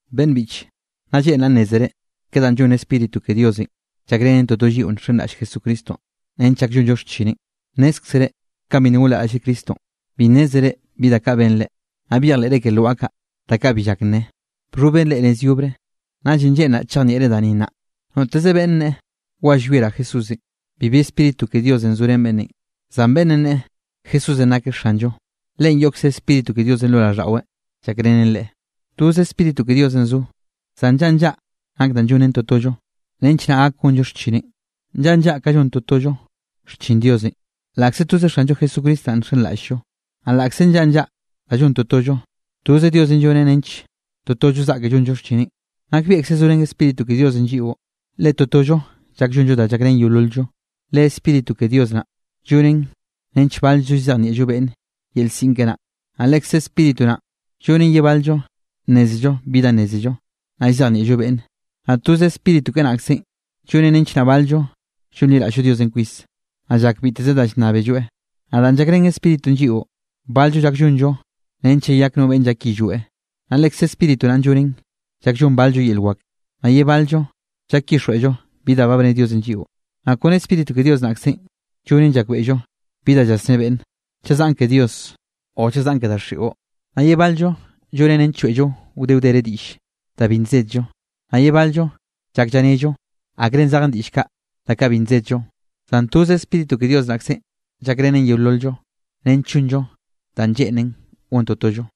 Beꞌnn biꞌche, nnaꞌ lleꞌnraꞌ nnézere ke danꞌ llon Spíritu ke Diosenꞌ llakrenen toto lliꞌo nxenraꞌll Jesucristonꞌ nench llak llonllo xchineꞌn. Nnézkzere kanꞌ bi nna gonliraꞌllre Cristonꞌ, bi nnézere bi da kaꞌ benre, naꞌ byejleꞌre ke lwaꞌa kaꞌ da kaꞌ bi llak nne, bxhoben reꞌ nez yobre. Naꞌllenꞌ lleꞌnraꞌ chejnieꞌre da ni nnaꞌ. Noteze beꞌnne nne: “Wa llwieraꞌ Jesúsenꞌ”, bibi Spíritu ke Diosenꞌ zorén beꞌnnenꞌ; zan beꞌnn nne: “Jesúsenꞌ nakeꞌ Xanllo”, leꞌen yoꞌkze Spíritu ke Diosenꞌ lo raꞌlldaꞌweꞌ llakrenen leꞌe. Toze Spíritu ke Diosenꞌ zo, zan nllaꞌa nllaꞌa nak danꞌ llonnen totollo nench naꞌ gak gonllo xchineꞌn. Nllaꞌa nllaꞌa ka llon totollo xchin Diosenꞌ laꞌkze toze Xanllo Jesucristo naꞌn nxenraꞌll-llo. Naꞌ laꞌkze nllaꞌa nllaꞌa da llon totollo, toze Diosenꞌ lloneꞌ nench totollo zaꞌke llonllo xchineꞌn. Nakbieꞌkze zorén Spíritu ke Diosenꞌ lliꞌo, le totollo llak llonllo da llakrén yeolol-llo. Le Spíritu ke Dios naꞌ, llonen nench bal-llo llzejnieꞌllo beꞌnne yel siꞌn keꞌe naꞌ, naꞌ lekze Spíritu naꞌn llonen ye bal-llo nnézello bi da nnézello, naꞌ llzejnieꞌllon beꞌnne. Naꞌ toze Spíritu keꞌe naꞌkzenꞌ llonen nench naꞌ bal-llo llonliraꞌll-llo Diosenꞌ kwis, naꞌll llak biteze da llnnábelloeꞌ. Naꞌ danꞌ llakrén Spíritunꞌ lliꞌo, bal-llo llak llonllo nench llayak no beꞌnn llak yillweꞌ. Naꞌ Lekze Spíritu naꞌn llonen llak llon bal-llo yel wak, naꞌ ye bal-llo llak llyixjweꞌllo bi da ba bne Diosenꞌ lliꞌo. Naꞌ kone Spíritu ke Dios naꞌkzenꞌ llonen llakbeꞌllo bi da llasné beꞌnne, chaꞌ zaꞌn ke Dios o chaꞌ zaꞌn ke daxiꞌo, naꞌ ye bal-llo, llonen nench lloeꞌllo wde wdere diꞌll da bi nsedllo, naꞌ ye bal-llo llak llanello akre zej diꞌll kaꞌ da kaꞌ bi nsedllo. Zan toze Spíritu ke Dios naꞌkzenꞌ llakrenen yeolol-llo nench llonllo danꞌ lleꞌnen gon totollo.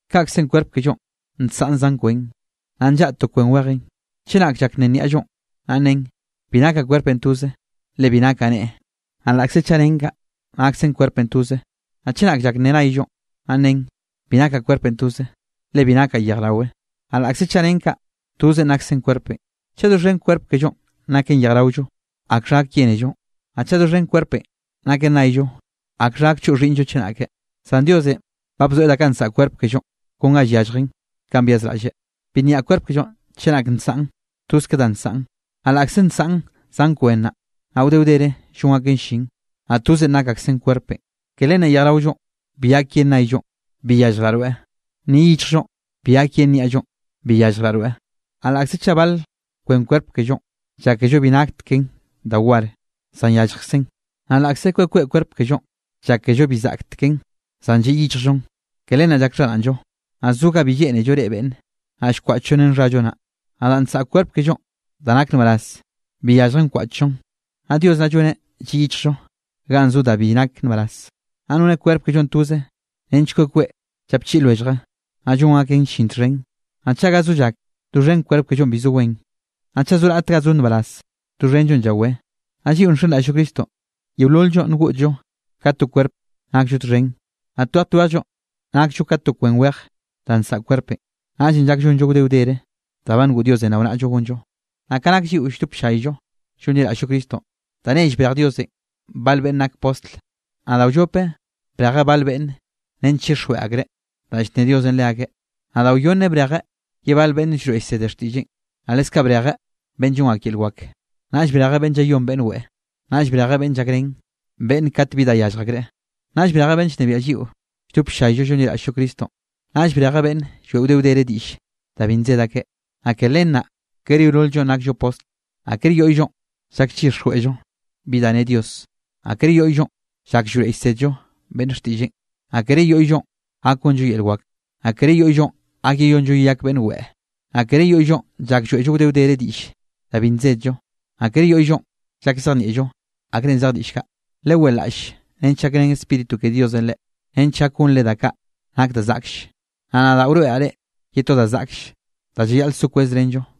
Kaꞌkzenꞌ kwerp kellonꞌ nsaꞌn zan kwen, naꞌ nllaꞌa to kwen wejenꞌ. Chenak llak nne niaꞌllonꞌ, naꞌ nnen: “Bi nakaꞌ kwerpenꞌ toze, le bi nakaꞌ neꞌe”, naꞌ laꞌkze chaꞌ nnen kaꞌ, naksen kwerpenꞌ toze. Naꞌ chenak llak nne nayllo, naꞌ nen: “Bi nakaꞌ kwerpenꞌ toze, le bi nakaꞌ yejraweꞌ”, naꞌ laꞌkze chaꞌ nnen kaꞌ, tozen naksen kwerpenꞌ. Chaꞌ doxhen kwerp kellonꞌ naken yejraollo, ¿akxha gak yénello? Naꞌ chaꞌ doxhen kwerpenꞌ naken nayllo, ¿akxha gak choꞌ xhiꞌnllo chenake? Zan Diosenꞌ ba bzoeꞌ da kaꞌ nsaꞌa kwerp kellonꞌ kon ga yalljen kanꞌ byazraꞌlleꞌ. Bi nyaꞌ kwerp kellonꞌ chenak nsaꞌn toz ke danꞌ nsaꞌn. Naꞌ laꞌkze nsaꞌn zan kwen naꞌ, naꞌ wde wdere llon aken llin, naꞌ toze nak aksen kwerpenꞌ. Ke len naꞌ yejraollonꞌ bi gak yen naꞌllonꞌ: “Bi yalljraꞌ rweꞌ.” Ni yichjllonꞌ bi gak yen niaꞌllonꞌ: “Bi yalljraꞌ rweꞌ.” Naꞌ laꞌkze chaꞌ bal kwen kwerp kellonꞌ, llákello bi nakteken da war, zan yalljkzen. Naꞌ laꞌkze kweꞌ kweꞌ kwerp kellonꞌ, llákello bi zaꞌkteken, zan lliꞌ yichjllonꞌ, ke len naꞌ llak xharaꞌnllo. Naꞌ zo ga bi lleꞌnello reꞌe beꞌnne, naꞌ llkwaꞌchllon ren xhallo naꞌ. Naꞌ da nsaꞌa kwerp kellonꞌ da nak nbaraz, bi yalljen wkwaꞌchllon. Naꞌ Dios naꞌ lloneꞌ lliꞌ yichjllo ganꞌ zo da kaꞌ bi nak nbaraz. Naꞌ noneꞌ kwerp kellonꞌ toze nench kweꞌ kweꞌ llapchiꞌi lwellje, naꞌ llon aken llin txhen. Naꞌ chaꞌ ga zo llak, doxhen kwerp kellonꞌ bi zo wen. Naꞌ chaꞌ zo raꞌt ga zo nbaraz, doxhenllo llawé. Naꞌ lliꞌo nxenraꞌll-llo Cristonꞌ, yeolol-llo ngoꞌdllo ka to kwerp naklloeꞌ txhen, naꞌ twej twejllo nakllo ka to kwen wej danꞌ nsaꞌa kwerpenꞌ, naꞌllenꞌ llak llonllo wde wdere da ba ngoꞌ Diosenꞌ rao naꞌllo gonllo. Naꞌ ka nak lliꞌo lldop ll-llayllo llonliraꞌll-llo Cristonꞌ, da nell brej Diosenꞌ bal beꞌnn nak postl, naꞌ da wllope brejeꞌ bal beꞌnne nench chixjweꞌ akreꞌ danꞌ llne Diosenꞌ leakeꞌ. Naꞌ da wyonne brejeꞌ ye bal beꞌnne llroeꞌ llsede xtiꞌlleꞌn. Naꞌ leskaꞌ brejeꞌ beꞌnn llon ak yel wak, naꞌll brejeꞌ beꞌnn llayón beꞌnn weꞌe, naꞌll brejeꞌ beꞌnn llakrén beꞌnne kat bi da yallj akreꞌ, naꞌll brejeꞌ beꞌnn llnebiaꞌ lliꞌo lldop ll-llayllo llonliraꞌll-llo Cristonꞌ, naꞌll brejeꞌ beꞌnn lloeꞌ wde wdere diꞌll da bi nsed akeꞌ. Naꞌ ke len naꞌ kere yeolol-llonꞌ nakllo postl. Naꞌ kere yoꞌyllonꞌ llak llyixjweꞌllo bi da ne Dios. Naꞌ kere yoꞌyllonꞌ llak llroeꞌ llsédello beꞌnne xtiꞌlleꞌn, naꞌ kere yoꞌyllonꞌ gak gonllo yel wak. Naꞌ kere yoꞌyllonꞌ gak yeyonllo yeyak beꞌnn weꞌe. Naꞌ kere yoꞌyllonꞌ llak lloeꞌllo wde wdere diꞌll da bi nsedllo. Naꞌ kere yoꞌyllonꞌ llak llzejnieꞌllo akre zej diꞌll kaꞌ. Leweꞌlaꞌll nench gakrén Spíritu ke Diosenꞌ reꞌ, nench gak gonre da kaꞌ nak da zaꞌklle. Naꞌ nadaꞌ wroeꞌraꞌ reꞌ ye to da zaꞌklle da llayaꞌl so kwezrenllo.